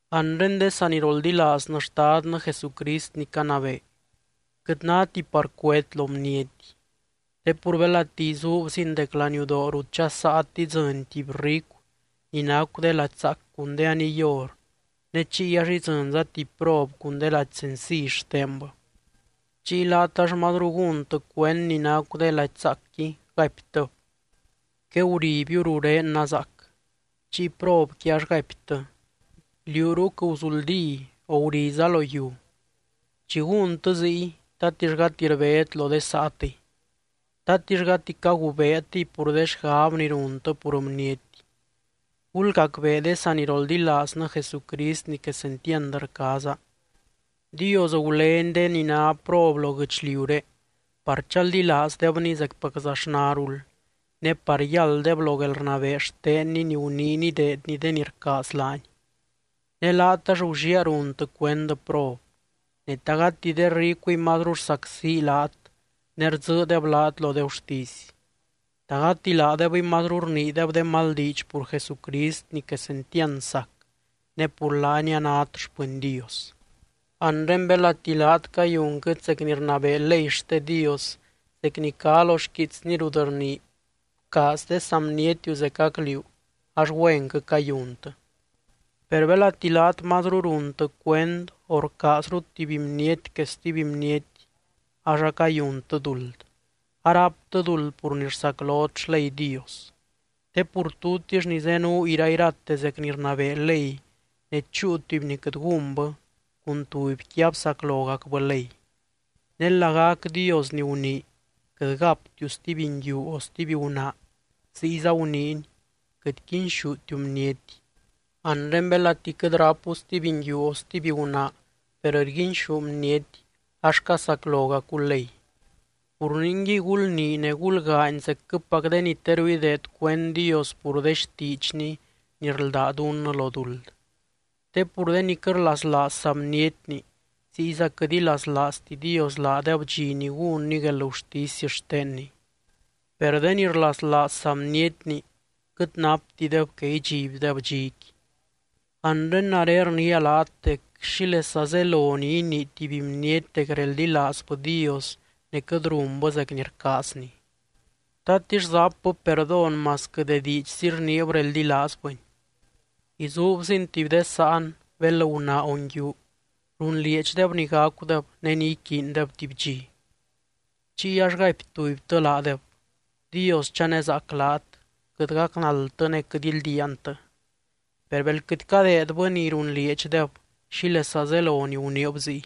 Anre de saniroldilaaznɨ Xtadnɨ Jesucrist ni canabee, quɨt náti par cuét lo bniety. Te pur belati izuubzin dec laniudoo rut dxasaat idzɨny tuby ricu ni nacu de lady zaac cun de aniy or, ne chiy ax idzɨnza tuby prob cun de lady senciy xtenbɨ. Chiy laat ax mazru gúntɨ cuend ni nacu de lady zaacqui gaiptɨb: “Queguribiu ruré nazaac.” Chiy probqui ax gaiptɨ: “Liú ruc guzuldí, o guriza lo yiu.” Chi gúntɨ ziy, ¿tatix gati rbét lo de saatɨy? ¿Tatix gati cagubeetɨy pur de xgab ni runtɨ pur bniety? Gulgacbee de saniroldilaaznɨ Jesucrist ni quesentiand rcaaza: Dios gulény de ni ná prob lo guɨchliuré par chaldilaazdebny zecpaczaxnarul, ne par yálddeb lo guelrnabee xtenny ni guniiny ideedny de ni rcaaz laany. Ne laat ax gulliaa runtɨ cuend prob. Ne, ¿ta gati de ricuiy mazru rsacsi laat ne rdzɨɨdeb laat lo de gurtisy? ¿Ta gati laadebɨy mazru rniideb de mal diidx pur Jesucrist ni quesentiand sac ne pur laany anát xpɨny Dios? Anre belati laat cayunquɨt zec ni rnabee ley xte Dios zec ni cá lo xquiitsny rut rnii: “Bcaaz de saa bnietiu zecac liú”, ax güenquɨ cayuntɨ. Per belati laat mazru runtɨ cuend o rcaazrut tuby bniety que stuby bniety ax acayuntɨ duld, aráptɨ duld pur ni rsaclot xley Dios. Te pur tutix ni zenuu irairate zec ni rnabee ley ne chúu tuby ni quɨt gúnbɨ, cun tubyqui absaclogacbɨ ley. Ne lagac Dios ni gunii: “Quɨt gáptiu stuby nguiu o stuby gunaa”, ziyza guniiny: “Quɨt quinxútiu bniety.” Anre belati quɨt rápu stuby nguiu o stuby gunaa per rguinxú bniety, ax casaclogacu ley. Pur ningui gulnii ne gulgaany zecquɨpac de ni teru ideed cuend Dios pur de xtiidxny ni rldá dunnɨ lo duld. Te pur de ni quɨt rlaslaaz saa bnietni, ziyza quɨt ilaslaazti Dios laadeb dxi ni gúnny guelgurtisy xtenny. Per de ni rlaslaaz saa bnietni, quɨt naptideb que idxibdeb dxiqui. Anre nare rniia laat dec, ¿xílesa zelo ni inii tuby bniety dec reldilaazbɨ Dios ne quɨt runbɨ zec ni rcaazny? ¿Tatix zapbɨ perdón masquɨ de diidxzi rniib reldilaazbɨny? Izuubzin, tuby de sáan bel gunaa o nguiu runlieedxdeb ni gacudeb ne ni iquiindeb tuby dxi. Chiy ax gaipy tubytɨ laadeb: “Dios chanezaac laat, quɨt gacnaldtɨ ne quɨt ildiaantɨ.” Per bel quɨt cadeedbɨ ni runlieedxdeb, ¿xílesa zelo ni guniib ziy?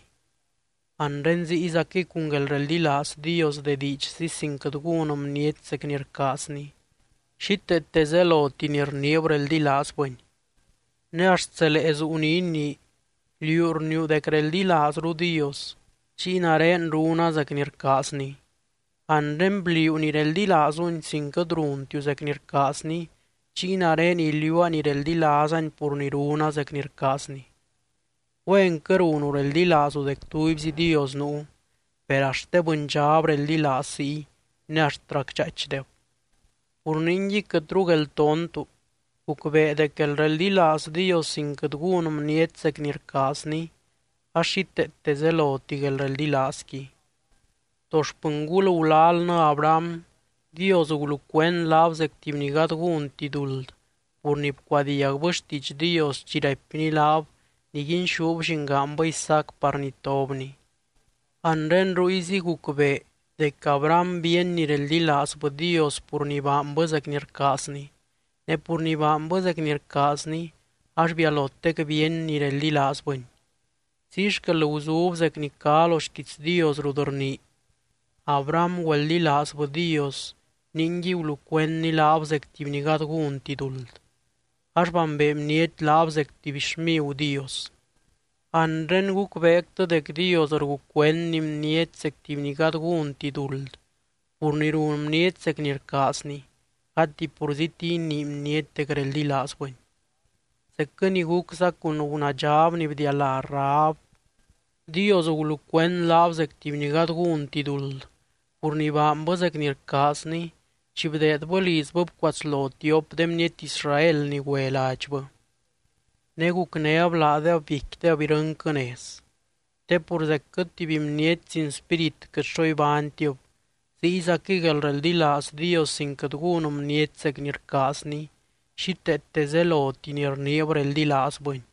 Anre ziyzaquɨy cun guelreldilaaz Dios de diidxzi sin quɨt gún bniety zec ni rcaazny, xíteete zeloti ni rniib reldilaazbɨny. Ne axt zelee zuu ni inii: “Liú rniiu dec reldilaazru Dios, chiy nare runa zec ni rcaazny.” Anre bliuu ni reldilaazuny sin quɨt runtiu zec ni rcaazny, chiy nare iliuua ni reldilaazany pur ni runa zec ni rcaazny. Güenquɨ runu reldilaazu dec tubyzi Dios nuu, per axt de bɨndxab reldilaaz ziy ne axt racdxaaichdeb. Pur ningui quɨtru gueltontu, gucbee dec guelreldilaaz Dios sin quɨt gún bniety zec ni rcaazny, ax xíteete zeloti guelreldilaazqui. To xpɨngul gulalnɨ Abraham Dios gulucuend laab zec tuby ni gady gúnti duld pur ni bcuadiagbɨ xtiidx Dios chi raipny laab niguinxúb llingaanbɨ Isaac par nitobny. Anre ruyzi gucbee dec Abraham bíeny ni reldilaazbɨ Dios pur ni baanbɨ zec ni rcaazny, ne pur ni baanbɨ zec ni rcaazny ax bialotec bíeny ni reldilaazbɨny. Ziy xquel guzub zec ni cá lo xquiits Dios rut rnii: “Abraham güeldilaazbɨ Dios ningui gulucuendny laab zec tuby ni gady gúnti duld”, ax bambee bniety laab zec tuby xmigu Dios. Anre gucbeectɨ dec Dios rgucuendny bniety zec tuby ni gady gúnti duld pur ni run bniety zec ni rcaazny, gati purzíti ni inii bniety dec reldilaazbɨny. Zecquɨ ni gucza cun gunaadxab ni bdialá Rahab. Dios gulucuend laab zec tuby ni gady gúnti duld pur ni baanbɨ zec ni rcaazny chi bdeedbɨ lizbɨ bcuatslo tiop de bniety Israel ni güe ladxbɨ, ne gucnéb laadeb biecquideb irɨnquɨ nez. Te pur zecquɨ tuby bniety sin spírit quɨt xo ibánytib, ziyzaquɨy guelreldilaaz Dios sin quɨt gún bniety zec ni rcaazny, xíteete zeloti ni rniib reldilaazbɨny.